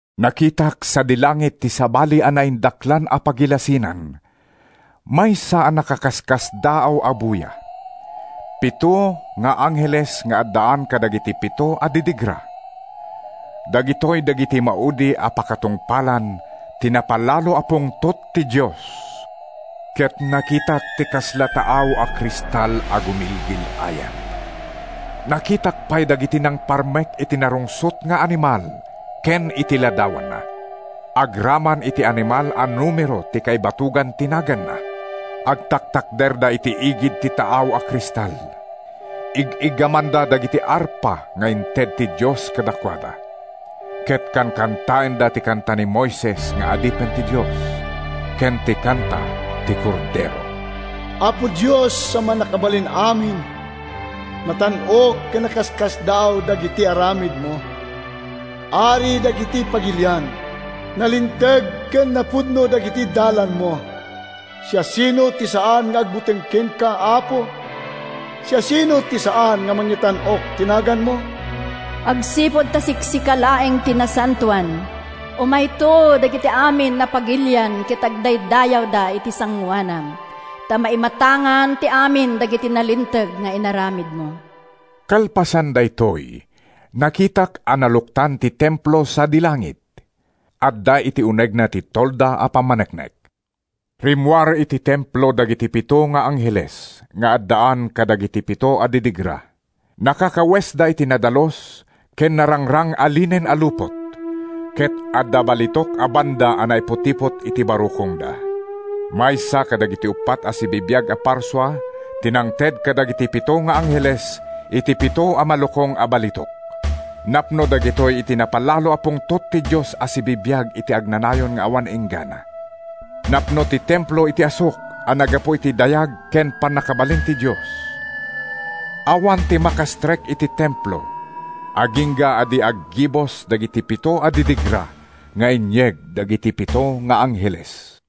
Nakitak sadi langit ti sabali a naindaklan a pagilasinan, maysa a nakaskasdaaw a buya. Pito nga angheles nga addaan kadagiti pito a didigra. Dagitoy dagiti maudi a pakatungpalan ti napalalo a pungtot ti Dios. Ket nakitak ti kasla taaw a kristal a gumilgil-ayab. Nakitak pay dagiti nangparmek iti narungsot nga animal ken iti ladawanna, agraman iti animal a numero ti kaibatogan ti naganna. Agtatakderda iti igid ti taaw a kristal; ig-iggamanda dagiti arpa nga inted ti Dios kadakuada. Ket kankantaenda ti kanta ni Moises nga adipen ti Dios, ken ti kanta ti Kordero: “Apo Dios a Mannakabalin-amin Natan-ok ken nakaskasdaaw dagiti aramidmo! Ari dagiti pagilian. Nalinteg ken napudno dagiti dalanmo! Siasino ti saan nga agbuteng kenka, Apo? Siasino ti saan a mangitan-ok iti naganmo? Agsipud ta siksika laeng ti nasantoan. Umayto dagiti amin a pagilian Ket agdaydayawda iti sangoanam, Ta maimatangan ti amin dagiti nalinteg nga aramidmo.” Kalpasan daytoy, nakitak a naluktan ti templo sadi langit. Adda iti unegna ti tolda ti pammaneknek. Rimmuar iti templo dagiti pito nga angheles nga addaan kadagiti pito a didigra. Nakakawesda iti nadalus ken narangrang a linen a lupot ket adda balitok a banda a naiputipot iti barukongda. Maysa kadagiti uppat a sibibiag a parsua ti nangted kadagiti pito nga angheles iti pito a malukong a balitok. Napno dagitoy iti napalalo a pungtot ti Dios a sibibiag iti agnanayon nga awan inggana. Napno ti templo iti asuk a naggapu iti dayag ken pannakabalin ti Dios. Awan ti makastrek iti templo agingga a di aggibus dagiti pito a didigra nga inyeg dagiti pito nga angheles.